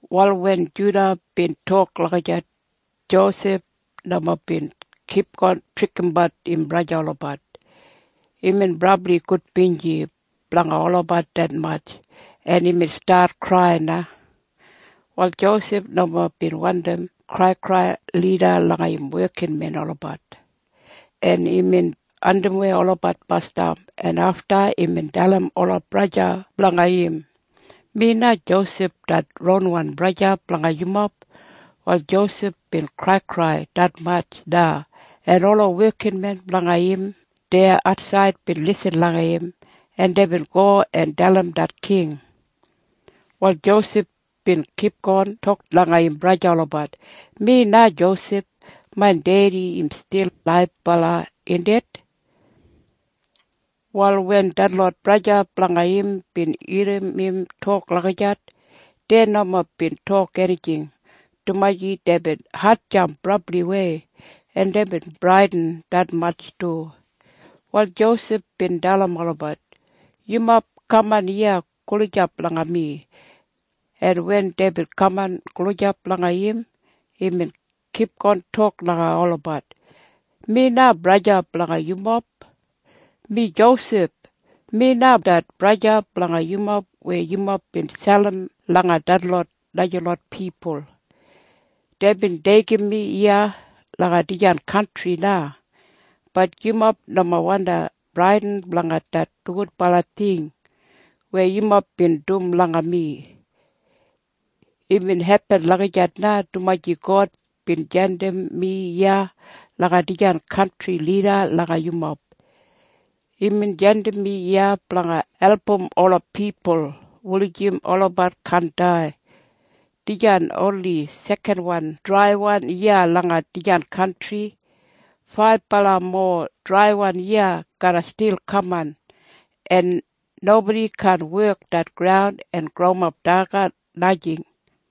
Wal wen Juda bin tok lagijat, Josef nomo bin kipgon trikimbat im braja olabat. Imbin brabli gudbinji blanga olabat detmatj, en imbin stat krai na. Wal Josef nomo bin wandi kraikrai lida langa im wekinmen olabat, en imbin andimwei olabat basdam, en afta imbin dalim ola braja blanga im, “Mi na Josef det ronwan braja blanga yumob.” Wal Josef bin kraikrai detmatj na, en ola wekinmen blanga im deya atsaid bin lisin langa im, en deibin go en dalim det king. Wal Josef bin kipgon tok langa im braja olabat, “Mi na Josef. Main dedi im stil laibala, indit?” Wal wen detlot braja blanga im bin irrim im tok lagijat, dei nomo bin tok enijing, dumaji deibin hatjamp brabliwei, en deibin bradin detmatj du. Wal Josef bin dalim olabat, “Yumob kaman iya gulijap langa mi.” En wen deibin kaman gulijap langa im, imbin kipgon tok langa olabat, “Mi na braja blanga yumob. Mi Josef. Mi na det braja blanga yumob weya yumob bin selim langa detlot najalot pipul. Deibin deigim mi iya langa dijan kantri na. Bat yumob nomo wandi bradin blanga det nogudbala ting weya yumob bin dum langa mi. Imbin hepin lagijat na dumaji God bin jandim mi iya langa dijan kantri lida langa yumob. Imbin jandim mi iya blanga album ola pipul wulijim olabat kaan dai. Dijan oni sekanwan draiwan yiya langa dijan kantri. Faibala mowa draiwan yiya garra stil kaman. En nobodi kaan wekim det graun en growimap daga, najing.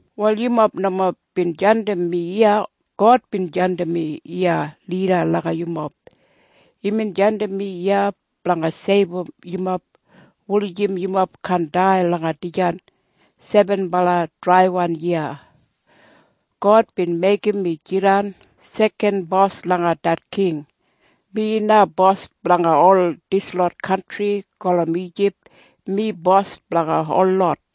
“Wal yumob nomo bin jandim mi iya. God bin jandim mi iya lida langa yumob. Imbin jandim mi iya blanga seibum yumob wulijim yumob kaan dai langa dijan sebenbala draiwan yiya. God bin meigim mi jidan sekanbos langa det king. Mi na bos blanga ol dislot kantri gulum Ijip. Mi bos blanga holot.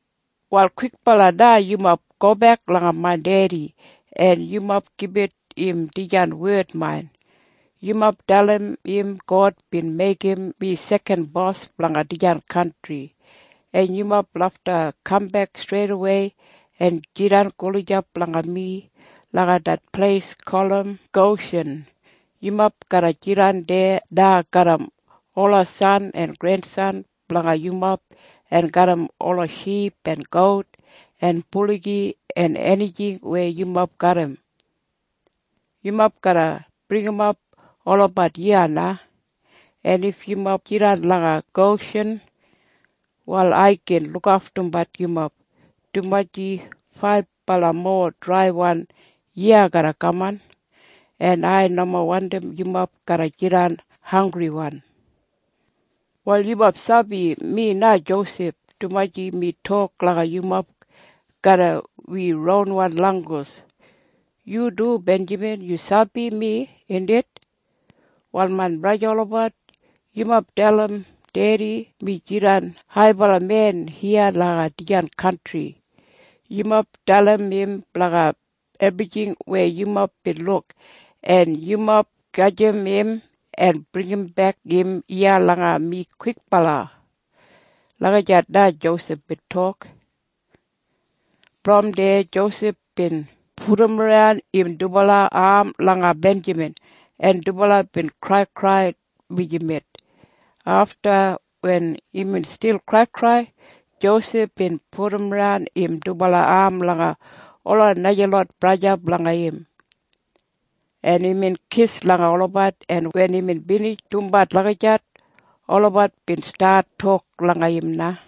“Wal kwikbala na yumob gobek langa main dedi, en yumob gibit im dijan wed main. Yumob dalim im God bin meigim mi sekanbos blanga dijan kantri. En yumob lafta kambek streidawei en jidan gulijap langa mi langa det pleis gulum Goshin. Yumob garra jidan deya na garram ola san en grensan blanga yumob en garram ola ship en gout en buligi en enijing weya yumob garram. Yumob garra bringimap olabat iya na. En if yumob jidan langa Goshin, wal ai gin lukaftumbat yumob, dumaji faibala mowa draiwan yiya garra kaman, en ai nomo wandim yumob garra jidan hanggriwan. “Wal yumob sabi mi na Josef, dumaji mi tok langa yumob garram wi ronwan langgus. Yu du, Benjamin, yu sabi mi, indit? “Wal main braja olabat, yumob dalim dedi mi jidan haibala men iya langa dijan kantri. Yumob dalim im blanga ebrijing weya yumob bin luk, en yumob gajim im en bringimbek im iya langa mi kwikbala.” Lagijat na Josef bin tok. Brom deya Josef bin pudumran im dubala am langa Benjamin, en dubala bin kraikrai mijamet. Afta wen imbin stil kraikrai, Josef bin pudumran im dubala am langa ola najawan braja blanga im, en imbin kis langa olabat, en wen imbin binij dumbat lagijat, olabat bin stat tok langa im na.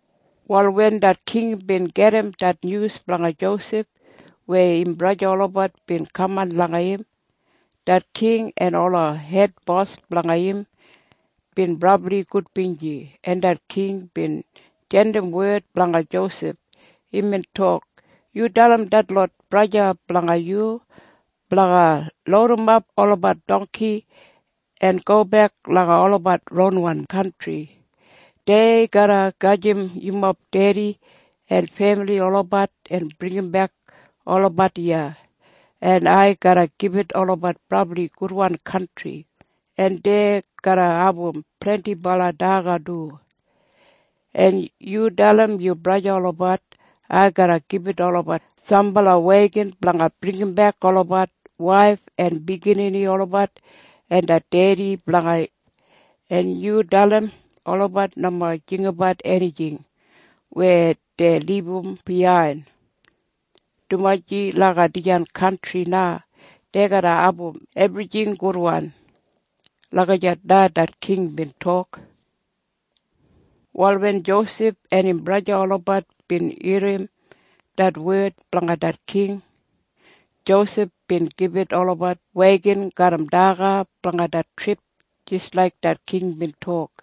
Wal wen det king bin gedim det nyus blanga Josef weya im braja olabat bin kaman langa im, det king en ola hedbos blanga im bin brabli gudbinji, en det king bin jandim wed blanga Josef. Imbin tok, “Yu dalim detlot braja blanga yu blanga loudimap olabat dongki en gobek langa olabat ronwan kantri. Dei garra gajim yumob dedi en femili olabat en bringimbek olabat iya, en ai garra gibit olabat brabli gudwan kantri, en dei garra abum blendibala daga du. En yu dalim yu braja olabat, ai garra gibit olabat sambala wegan blanga bringimbek olabat waif en biginini olabat en det dedi blanga yumob. En yu dalim olabat nomo jinggabat enijing weya dei libum biyain, dumaji langa dijan kantri na dei garra abum ebrijing gudwan.” Lagijat na det king bin tok. Wal wen Josef en im braja olabat bin irrim det wed blanga det king, Josef bin gibit olabat wegan garram daga blanga det trip jis laik det king bin tok.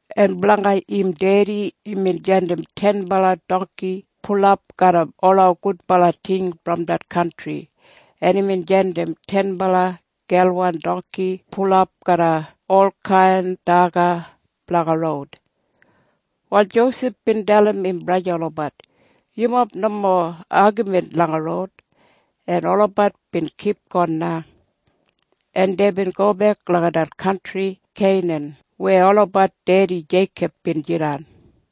En blanga im dedi imbin jandim tenbala dongki bulap garram ola gudbala ting brom det kantri, en imbin jandim tenbala gelwan dongki bulap garram olkain daga blanga roud. Wal Josef bin dalim im braja olabat, “Yumob nomo agamin langa roud.” En olabat bin kipgon na, en deibin gobek langa det kantri Keinan weya olabat dedi Jeikob bin jidan.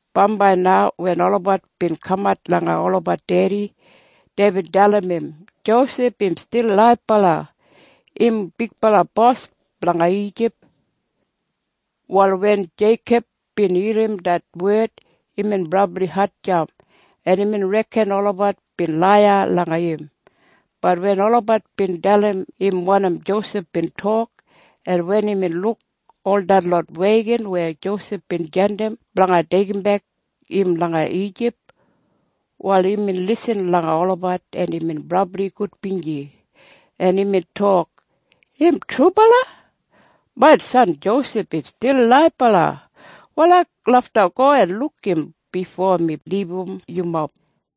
Bambai na wen olabat bin kamat langa olabat dedi, deibin dalim im, “Josef im stil laibala! Im bigbala bos blanga Ijip!” Wal wen Jeikob bin irrim det wed, imbin brabli hatjamp, en imbin reken olabat bin laiya langa im. Bat wen olabat bin dalim im wanim Josef bin tok, en wen imbin luk ol detlot wegan weya Josef bin jandim blanga deigimbek im langa Ijip, wal imbin lisin langa olabat en imbin brabli gudbinji, en imbin tok, “Im trubala? Main san Josef im stil laibala? Wal ai lafta go en luk im bifo ai libum yumob.”